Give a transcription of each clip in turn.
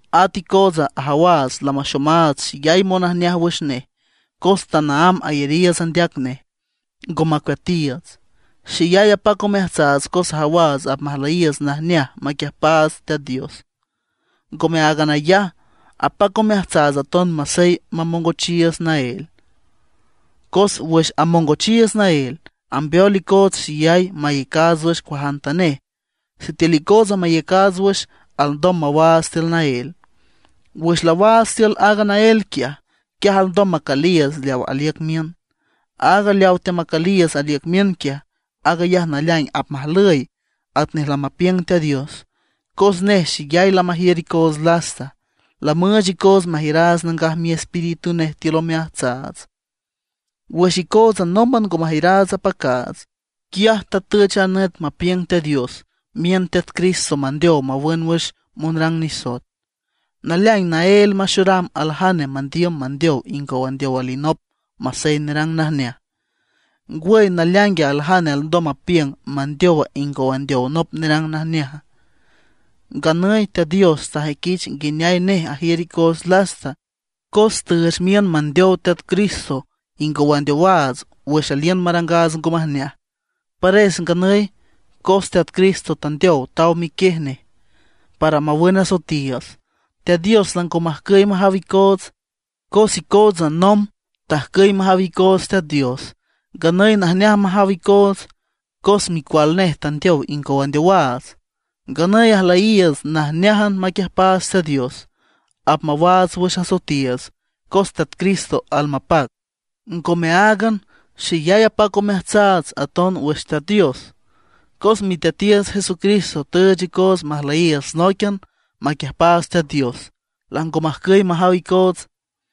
At icootsa ajawaats lamaxomaats xeyay monajneaj wüx nej cos tanaámb ayariiüts andeac nej, ngo macueatiiüts. Xeyay apac omeajtsaats cos ajawaats apmajlüyiiüts najneaj maquiüjpaats Teat Dios. Ngome áagan ayaj, apac omeajtsaats aton masey amongochiiüts naél. Cos wüx amongochiiüts naél, ambeol icoots xeyay maiücaats wüx cuajantanej. Sitiül icootsa maiücaats wüx alndom mawaats tiül naél; wüx laawaats tiül aaga naél quiaj, quiaj alndom macüliiüts leaw aliüc miün. Aaga leaw teamacüliiüts aliüc miün quiaj, aag ayaj naleaing apmajlüy atnej lamapiüng Teat Dios. Cos nej xeyay lamajiür icoots lasta, lamüüch icoots majiüraats Nangaj Miespíritu nej tiül omeajtsaats. Wüx icootsa nómban ngo majiüraats apacaats, quiaj tatüch a nüt mapiüng Teat Dios, miün Teat Cristo mandeow mawün wüx monrang nisoet. Naleaing naél maxoram aljane mandiüm mandeow ingow andeow alinop masey nerang najneaj. ¿Ngwüy naleaingue aljane alndom mapiüng mandeowa ingow andeow nop nerang najneaja? Nganüy Teat Dios tajüiquich nguineay nej ajiür icoots lasta, cos tüüch miün mandeow Teat Cristo ingow andeowaats wüx aliün marangaats ngo majneaj. Pares nganüy cos Teat Cristo tandeow taw miquiej nej para mawün asoetiiüts, Teat Dios lango majcüy majaw icoots. Cos icootsa nomb tajcüy majaw icoots Teat Dios; nganüy najneaj majaw icoots, cos Micual nej tandeow ingow andeowaats. Nganüy ajlüyiiüts najneájan maquiüjpaats Teat Dios, apmawaats wüx asoetiiüts cos Teat Cristo almapac. Ngome áagan, xeyay apac omeajtsaats aton wüx Teat Dios, cos Miteatiiüts Jesucristo tüüch icoots majlüyiiüts nóiquian maquiüjpaats Teat Dios, lango majcüy majaw icoots.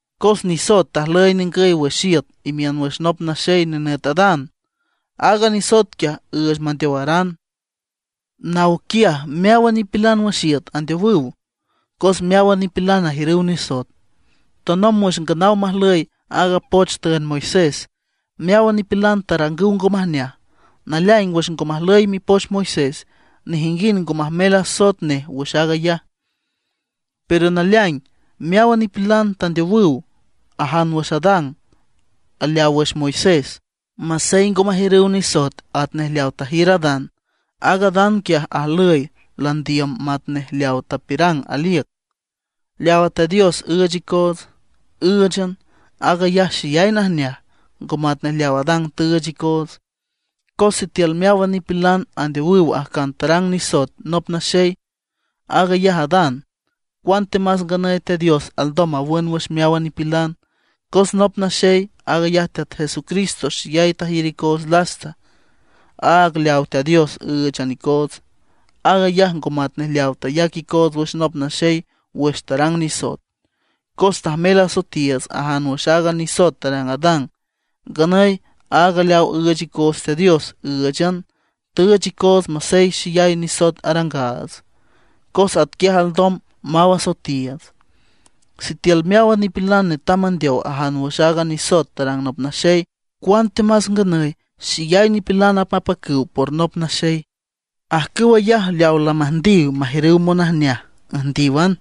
Cos nisoet tajlüy ningüy wüx iüt imiün wüx nop naxey nenüt Adán, aaga nisoet quiaj üüch mandeowaran. Naw quiaj meáwan nipilan wüx iüt andeowüw, cos meáwan nipilan ajiürüw nisoet. Tanomb wüx nganaw majlüy aaga poch tüünd Moisés, meáwan nipilan tarangüw ngo majneaj. Naleaing wüx ngo majlüy mipoch Moisés, nejinguind ngo majmel asoet nej wüx aag ayaj. Pero naleaing meáwan nipilan tandeowüw ajan wüx Adán aleaw wüx Moisés, masey ngo majiürüw nisoet atnej leaw tajiür Adán. Aaga Adán quiaj ajlüy landiüm matnej leaw tapiürang aliüc. Leawa Teat Dios üüch icoots, ǘüchan, aag ayaj xeyay najneaj, ngo matnej leaw Adán tüüch icoots. Cos sitiül meáwan nipilan andeowüw ajcan tarang nisoet nop naxey, aag ayaj Adán, cuantemas nganüy Teat Dios alndom mawün wüx meáwan nipilan, cos nop naxey, aag ayaj Teat Jesucristo xeyay tajiür icoots lasta. Aaga leaw Teat Dios ǘüchan icoots, aag ayaj ngo matnej leaw tayac icoots wüx nop naxey wüx tarang nisoet. Cos tajmel asoetiiüts ajan wüx aaga nisoet tarang Adán. Nganüy aaga leaw üüch icoots Teat Dios, ǘüchan, tüüch icoots masey xeyay nisoet arangaats, cos atquiaj alndom maw asoetiiüts. Sitiül meáwan nipilan netam mandeow ajan wüx aaga nisoet tarang nop naxey, cuantemas nganüy xeyay nipilan apmapacüw por nop naxey. Ajcüw ayaj leaw lamüjndiw majiürüw monajneaj, üjndíwan.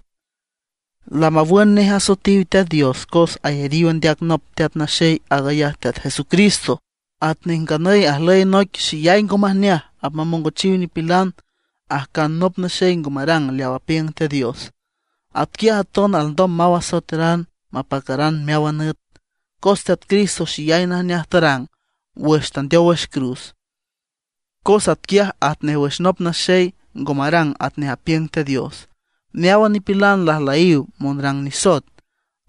Lamawün nej asoetiw Teat Dios cos ayariw andeac nop Teat Naxey aag ayaj Teat Jesucristo. Atnej nganüy ajlüy noic xeyay ngo majneaj apmamongochiw nipilan, ajcan nop naxey ngo marang leaw apiüng Teat Dios. Atquiaj aton alndom maw asoeteran mapacaran meáwan nüt, cos Teat Cristo xeyay najneaj tarang wüx tandeow wüx cruz. Cos atquiaj atnej wüx nop naxey ngo marang atnej apiüng Teat Dios, meáwan nipilan lajlüyiw monrang nisoet.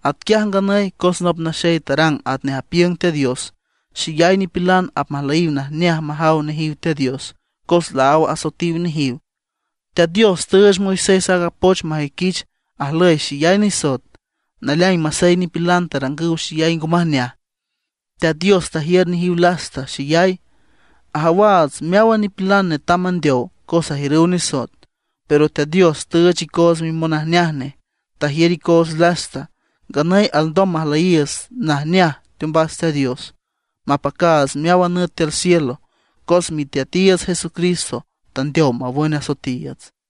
Atquiaj nganüy cos nop naxey tarang atnej apiüng Teat Dios, xeyay nipilan apmajlüyiw najneaj majaw nejiw Teat Dios, cos laáw asoetiw nejiw. Teat Dios tüüch Moisés aaga poch majüiquich ajlüy xeyay nisoet. Naleaing masey nipilan tarangüw xeyay ngo majneaj, Teat Dios tajiür nejiw lasta xeyay. Ajawaats meáwan nipilan netam mandeow cos ajiürüw nisoet, pero Teat Dios tüüch icoots mimonajneaj nej, tajiür icoots lasta. Nganüy alndom majlüyiiüts najneaj teombas Teat Dios, mapacaats meáwan nüt tiül cielo, cos Miteatiiüts Jesucristo tandeow mawün asoetiiüts.